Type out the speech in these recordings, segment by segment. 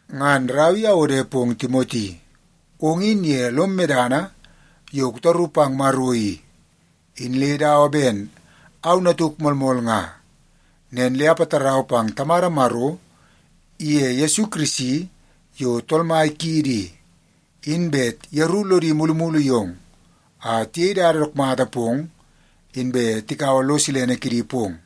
Ngan rau i awode pong Timoti. Ong in ye lom medana yo kutaru pang Maro i, in le dawa ben au natuk moolmool nga. Nen le apatarau pang Tamada Maro iye Yesu Kirisi yo Tool Mai kiidi i, in bet yeru lodi mulumulu yong a tiyei dada dook mata pong, inbe tikaua lo silene kidi pong.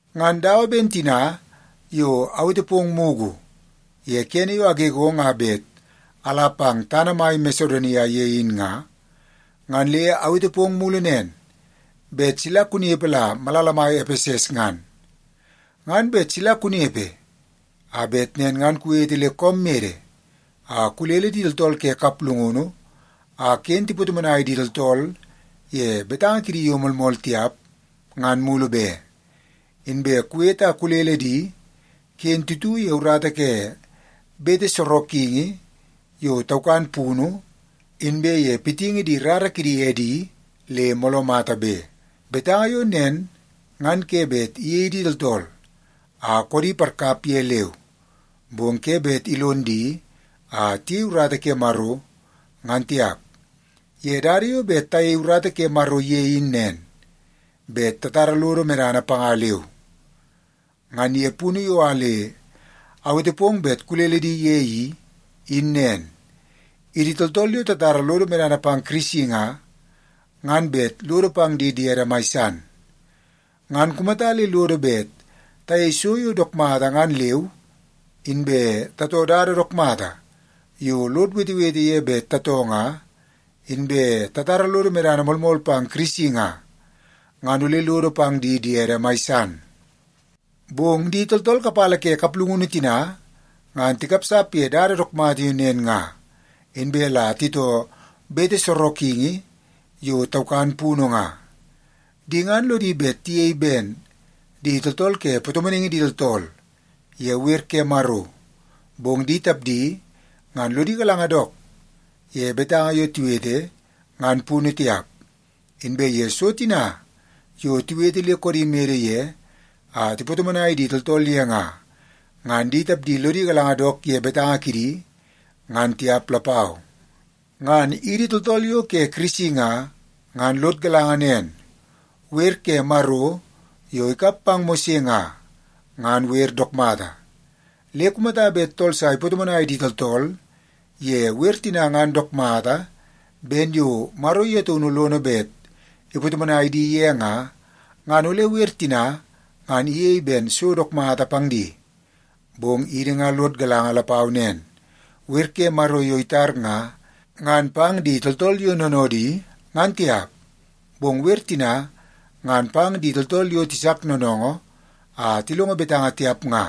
Ngan dawa ben tina yo awete pong mugu ye kene yo agegong a bet ala pang tana mai Masedonia ye in nga, ngan le awete pong mulu nen, bet sila kunepe la malala mai Epeses ngan. Ngan bet sila kunepe a bet nen ngan kuwete le koom mede a kulele di tooltool ke kaplungunu a ken tipatomonai di tooltool ye betanga kidi yo moolmool tiap ngan mulu be. Inbe kuwete a kulele di ken titu ye urata ke bete sorokingi yo taukan punu, inbe ye pitingi di rara kidi edi le mooloo mata be. Betanga yo nen ngan ke bet iyei di tooltool a koodi parkap ye leu, bong ke bet ilon di a tiyei urata ke Maro, ngan tiap. Ye dada yo bet tayei urata ke Maro ye in nen, bet tatara lodo medana panga leu. Ngan ye punu yo a le awete pong bet kulele di ye i, in nen. Idi tooltool yo tatara lodo medana pang Kirisi nga, ngan bet lodo pang di diede mai san. Ngan kumata le lodo bet tayei so yo dook mata ngan leu, inbe tatoo dada dook mata yo lod wetewete ye bet tatoo nga, inbe tatara lodo medana moolmool pang Kirisi nga, ngan ole lodo pang di diedi mai san. Bong di tooltool kapala ke kaplungunu tina ngan tikapsap ye dada dook mata yo nen nga, inbe la titoo bete sorokingi yo taukan punu nga. Di ngan lodi bet tiyei ben di tooltool ke patomonaingi di tooltool ye wer ke Maro, bong di tapdi ngan lodi galanga dook ye betanga yo tiwete, ngan punu tiap. Inbe ye so tina yo tiwete le koodi mede ye a tipatomonai di tooltool ye nga, ngan di tapdi lodi galanga dook ye betanga kidi, ngan tiap lapau. Ngan idi tooltool yo ke Kirisi nga, ngan lod galanga nen, wer ke Maro yo ikap pang Mose nga, ngan wer dook mata. Le kumata bet tool sa ipatomonai di tooltool ye wer tina ngan dook mata ben yo Maro ye taunu lono bet ipatomonai di ye nga, ngan ole wer tina ngan iyei ben so dook mata pang di. Bong idi nga lod galanga lapau nen, wer ke Maro yo itar nga, ngan pang di tooltool yo noonoodi, ngan tiap. Bong wer tina ngan pang di tooltool yo tisak noonoongoo a tilongo betanga tiap nga,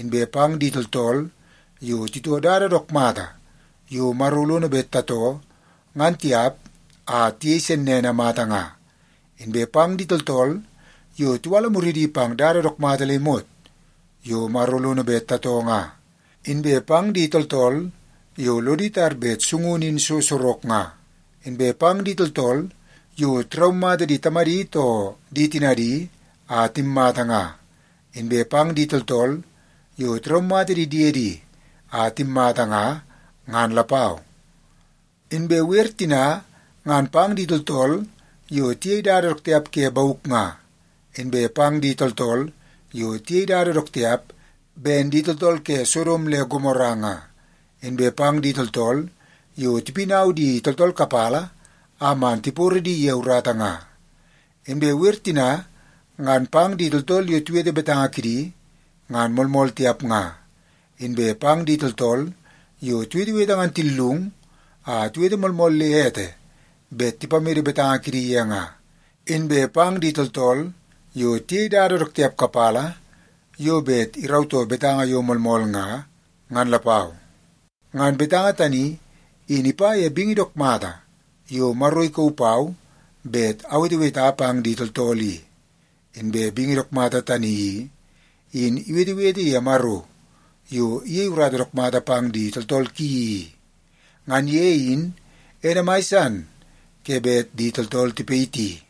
inbe pang di tooltool yo titoo dada dook mata yo Maro lono bet tatoo ngan tiap a tiyei sennene mata nga, inbe pang di tooltool yo tiwala muridi pang dada dook mata le imot yo Maro lono bet tatoo nga, inbe pang di tooltool yo lodi tar bet sungunu in so sorok nga, inbe pang di tooltool yo tiraumata di tamadi too di tinadi a timmata nga, inbe pang di tooltool yo tiraumata di diedi a timmata nga, ngan lapau. Inbe wer tina ngan pang di tooltool yo tiyei dada dook tiap ke bauk nga, inbe pang di tooltool yo tiyei dada dook tiap ben di tooltool ke Sodom le Gomora nga, inbe pang di tooltool yo tipinau di tooltool kapala a man tiporo di ye urata nga. Inbe wer tina ngan pang di tooltool yo tiwete betanga kidi ngan moolmool tiap nga, inbe pang di tooltool yo tiwetewete ngan tillung a tiwete moolmool le ete bet tipamede betanga kidi ye nga, inbe pang di tooltool yo tiyei dada dook tiap kapala yo bet irautoo betanga yo moolmool nga, ngan lapau. Ngan betanga tani, in ipa ye bingi dook mata yo Maro ikauu pau bet aweteweta pang di tooltool i. Inbe bingi dook mata tani i, in iwetewete ye Maro yo iyei urata dook mata pang di tooltool ki i. Ngan ye in ene mai san ke bet di tooltool tipayiti.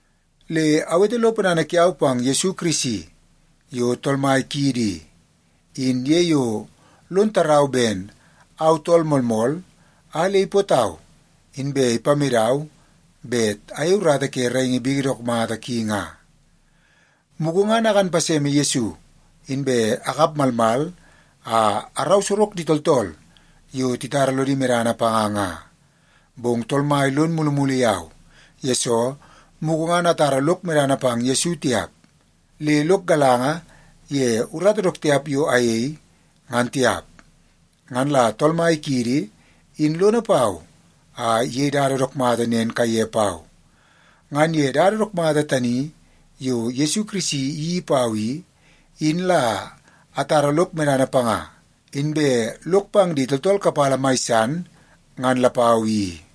Le awete lo ponana kiau pang Yesu Kirisi yo Tool Mai kiidi i, in ye yo lon tarau ben au tool moolmool a le ipootau inbe ipamedau bet ayei urata ke raingi bingi dook mata ki nga. Mugu ngan akan paseme Yesu, inbe akap malmal a arau sorok di tooltool yo titara lodi medana panga nga. Bong Tool Mai lon mulumulu yau, yesoo mugu ngan atara lok medana pang Yesu tiap, le lok galanga ye urata dook tiap yo ayei, ngan tiap. Ngan la Tool Mai kiidi in lono pau a iyei dada dook mata nen kaiye pau. Ngan ye dada dook mata tani yo Yesu Kirisi iyeii pau i, in la atara lok medana panga, inbe lok pang di tooltool kapala mai san, ngan lapau i.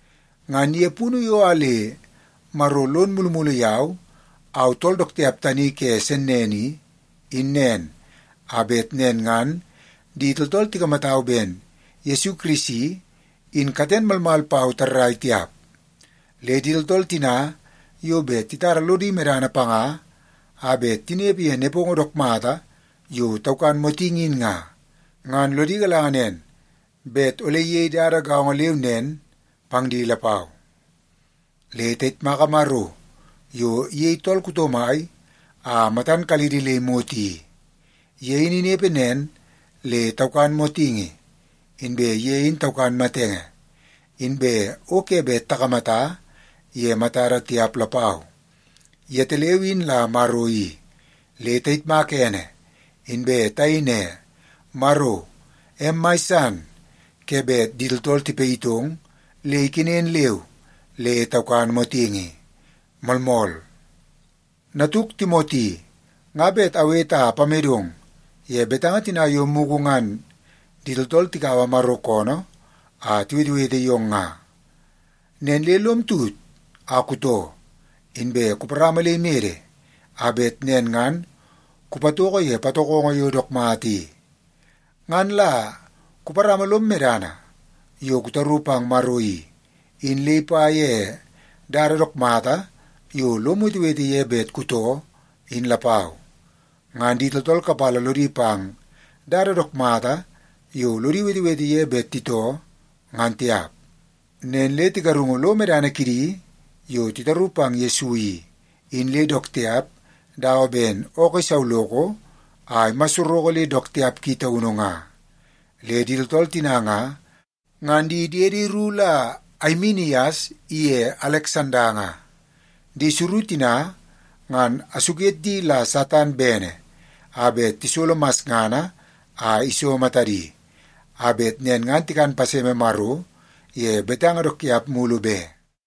Ngan ye punu yo a le Maro lon mulumulu yau, au tool dook tiap tani ke sennene i, in nen a bet nen ngan di tooltool tikamatau ben Yesu Kirisi, in katen malmal pau tarrai tiap. Le di tooltool tina yo bet titara lodi medana panga a bet tinepe ye nepongo dook mata yo taukan motingi in nga, ngan lodi galanga nen bet ole iyei dada gaongo leu nen pang di lapau. Le tayitmaka Maro yo iyei tool kuto mai a matan kalidi le imot i. Ye in inepe nen le taukan motingi, inbe ye in taukan matenge, inbe o ke bet takamata ye matada tiap lapau. Yetaleu in la Maro i. Le tayitmaka ene inbe tayei ne, “Maro, em mai san ke bet di tooltool tipayitong le ikenen leu le taukan motingi.” Moolmool. Natuk Timoti, nga bet awete a apamedong ye betanga tina yo mugu ngan di tooltool tikaua Maro koonoo a tiwetewete yong nga. Nen le lom tut a kutoo, inbe kuparama le imede a bet nen ngan kupatoko ye patokongo yo dook mata i. Ngan la kuparama lom medana yo kutaru pang Maro i, in le ipa ye dada dook mata yo lom wetewete ye bet kutoo, in lapau. Ngan di tooltool kapala lodi pang dada dook mata yo lodi wetewete ye bet titoo ngan tiap. Nen le tigarungu lo medana kidi yo titaru pang Yesu i, in le dook tiap dawa ben ookoo isauloko a imassoroko le dook tiap ki taunu nga. Le di tooltool tina nga, ngan di diedi ru la Aimenias iye Aleksanda nga. Di suru tina ngan asuket di la Satan bene a bet tisolo masngana a iso matadi, a bet nen ngan tikan paseme Maro ye betanga dook tiap mulu be.